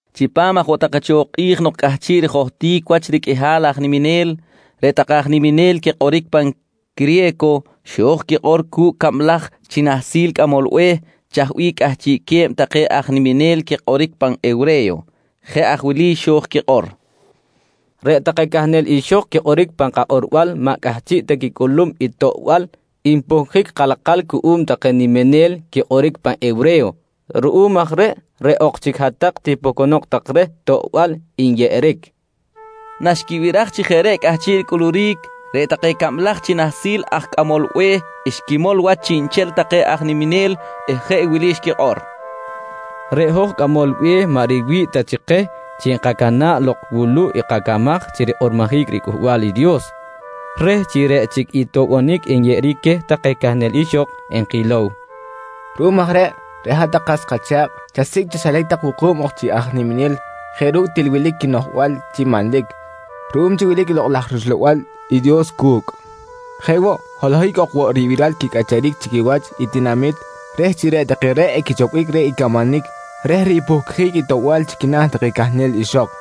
Chipam aj woꞌ take cho kꞌi̱j nok cꞌahchiꞌ rijohtic wach riqꞌuihal aj niminel, reꞌ take aj niminel quikꞌoric pan criye̱co xo̱j quikꞌor cu̱cꞌ cablaj chi nahsil cꞌamol be̱h chaj bih cꞌahchiꞌque̱b take aj niminel quikꞌoric pan hewre̱yo. Jeꞌ aj wili xo̱j quikꞌor: «Reꞌ take cahnel ixok quikꞌoric pan kakꞌorbal maꞌ cꞌahchiꞌ ta quicꞌulum i toꞌbal npuhcjic kalakal cuꞌum take niminel quikꞌoric pan hewre̱yo. Ruꞌum aj reꞌ, reꞌ ok chic hat-tak tipuhcunok tak reh toꞌbal nyeꞌeric, nqui take cok. Naxquibiraj chi jeꞌ reꞌ cꞌahchiꞌ ricꞌuluric, reꞌ take cablaj chi nahsil aj cꞌamol be̱h xquimol wach chiꞌnchel take aj niminel eh jeꞌ wili xquikꞌor: «Reꞌ hoj cꞌamol be̱h maꞌ riwi̱ꞌ ta chi keh chi enkacana̱ꞌ lok wuluꞌ i kacamaj chi rikꞌormojic riCꞌuhbal i Dios reh chi reꞌ chic i toꞌbonic nyeꞌeric queh take cahnel ixok enkilow. Ruꞌum aj reꞌ, reꞌ hat-tak kas kacha̱kꞌ chasicꞌ chaxilac tak wuku̱b ok chi aj niminel jeꞌ ru̱cꞌ til wilic quinoꞌjbal chi manlic ruꞌum chi wilic i Lokꞌ laj rUxlabal i Dios cu̱cꞌ. Jeꞌ woꞌ holohic ok woꞌ ribiral quicꞌacharic chi quiwach i tinamit reh chi reꞌ take reꞌ equichopbic reh i camanic reh ripuhcjic i toꞌbal chi quina̱ take cahnel ixok.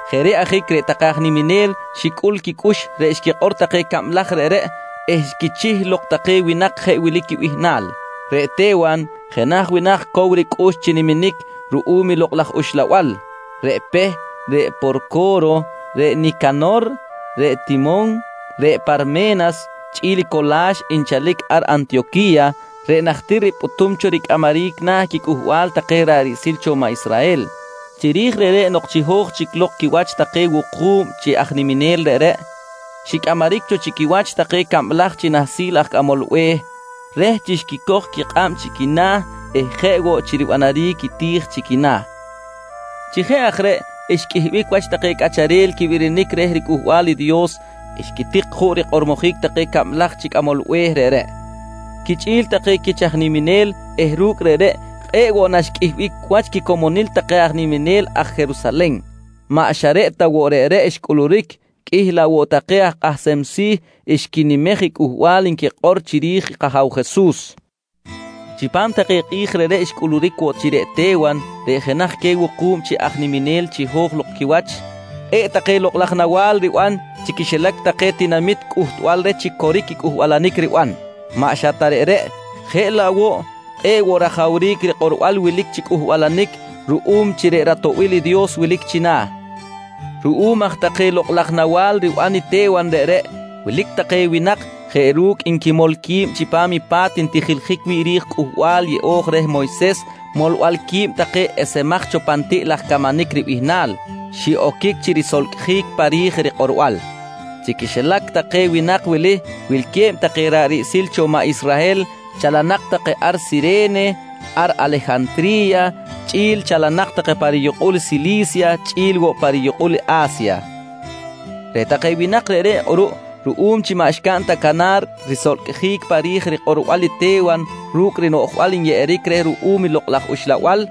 Jeꞌ reꞌ ajic reꞌ take aj niminel xicꞌul quicꞌux reꞌ xquikꞌor take cablaj reꞌreꞌ eh xquichih lok take winak jeꞌ wili quibihnal: Reꞌ Te̱wan, jenaj winak cow ricꞌux chi niminic ruꞌum i Lokꞌ laj Uxlabal, reꞌ Peh, reꞌ Porco̱ro, reꞌ Nicanor, reꞌ Timon, reꞌ Parme̱nas chꞌi̱l i Cola̱x nchalic ar Antiyoqui̱ya reꞌ najtir ripꞌutum cho ricꞌamaric na̱ quicꞌuhbal take ra̱ꞌ riꞌsil cho maꞌ Israhel. Chiri̱j reꞌreꞌ nok chiho̱j chic lok quiwach take wuku̱b chi aj niminel reꞌreꞌ xicꞌamaric cho chi quiwach take cablaj chi nahsil aj cꞌamol be̱h, reh chi xquicoj quikꞌab chi quina̱ eh jeꞌ woꞌ chi ribanaric i ti̱j chi quina̱. Chi jeꞌ aj reꞌ xqꞌuihbic wach take cꞌacharel quibirinic reh riCꞌuhbal i Dios xquitik juꞌ rikꞌormojic take cablaj chi cꞌamol be̱h reꞌreꞌ quichꞌi̱l take quich aj niminel eh ru̱cꞌ reꞌreꞌ, kꞌe̱ꞌ woꞌ naxqꞌuihbic wach i quicomonil take aj niminel ar Jerusalen. Maꞌ xa reꞌ ta woꞌ reꞌreꞌ xcꞌuluric, qꞌuih laꞌ woꞌ take aj kꞌahsem si̱ xquinimej i cꞌuhbal nkꞌoric chiri̱j i kAja̱w Jesus. Chipam take kꞌi̱j reꞌreꞌ xcꞌuluric woꞌ chi reꞌ Te̱wan reꞌ jenaj queh wuku̱b chi aj niminel chiho̱j quiwach, kꞌe̱ꞌ take lokꞌ laj nawa̱l riban chi quixilac take tinamit cꞌuhtbal queh chi til coric i cꞌuhbalanic riban. Maꞌ xa reꞌ ta reꞌ, jeꞌ laꞌ woꞌ kꞌe̱ꞌ woꞌ rajawric i rikꞌorbal wilic chi cꞌuhbalanic ruꞌum chi reꞌ ratoꞌbil i Dios wilic china̱. Ruꞌum aj take lokꞌ laj nawa̱l riban i Te̱wan reꞌreꞌ, wilic take winak jeꞌ ru̱cꞌ nquimol qui̱b chipam i pa̱t ntijiljic wi̱ꞌ ri̱j i Cꞌuhbal Yeꞌo̱j reh Moyses “Molbal qui̱b take esemaj cho pan tiꞌ laj camanic” ribihnal, xiꞌoquic chi risolcꞌjic pa ri̱j rikꞌorbal. Chi quixilac take winak wili wilque̱b take ra̱ꞌ riꞌsil cho maꞌ Israhel chalanak take ar Sire̱ne, ar Alejantri̱ya, chꞌi̱l chalanak take pa riyukꞌul Sili̱sya, chꞌi̱l woꞌ pa riyukꞌul i A̱sya. Reꞌ take winak reꞌreꞌ kꞌuruꞌ, ruꞌum chi maꞌ xcaꞌn ta canar risolcꞌjic pa ri̱j rikꞌorbal i Te̱wan ru̱cꞌ rinoꞌjbal nyeꞌeric reh ruꞌum i Lokꞌ laj Uxlabal,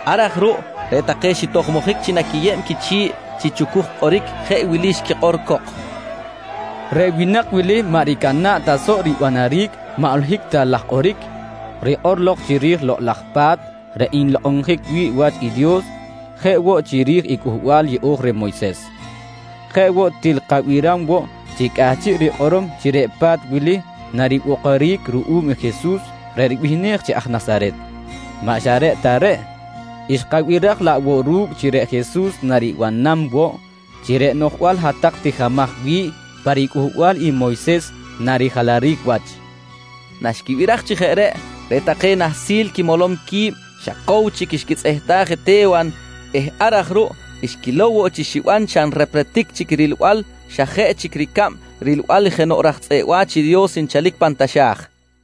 Ar aj ruꞌ reꞌ take xitojmojic chi naquiyeb quichi̱ꞌ chi chucuj kꞌoric jeꞌ wili xquikꞌor cok: «Reꞌ winak wili maꞌ ricana̱ꞌ ta soꞌ ribanaric maꞌ holohic ta laj kꞌoric rikꞌor lok chiri̱j Lokꞌ laj Pa̱t reꞌ nlokꞌonjic wi̱ꞌ wach i Dios jeꞌ woꞌ chiri̱j i Cꞌuhbal yeꞌo̱j reh Moyses. Jeꞌ woꞌ, til kabiram woꞌ chi cꞌahchiꞌ rikꞌorom chi reꞌ pa̱t wili naribokoric ruꞌum i Jesus reꞌ ribihnej chi aj Nasaret. Maꞌ xa reꞌ ta reꞌ, xkabiraj laꞌ woꞌ ru̱cꞌ chi reꞌ Jesus naribanam woꞌ chi reꞌ noꞌjbal hat-tak tijimaj wi̱ꞌ pa ricꞌuhbal i Moyses narijalaric wach, nqui take cok. Naxquibiraj chi jeꞌ reꞌ, reꞌ take nahsil quimolom qui̱b xa cow chic xquitzꞌehtaj i Te̱wan eh ar aj ruꞌ xquilow woꞌ chi xiban xa nrepretic chic i rilbal xa jeꞌ chic ricab rilbal jenoꞌ raj tzꞌeꞌ wa̱ch i Dios nchalic pan taxa̱j.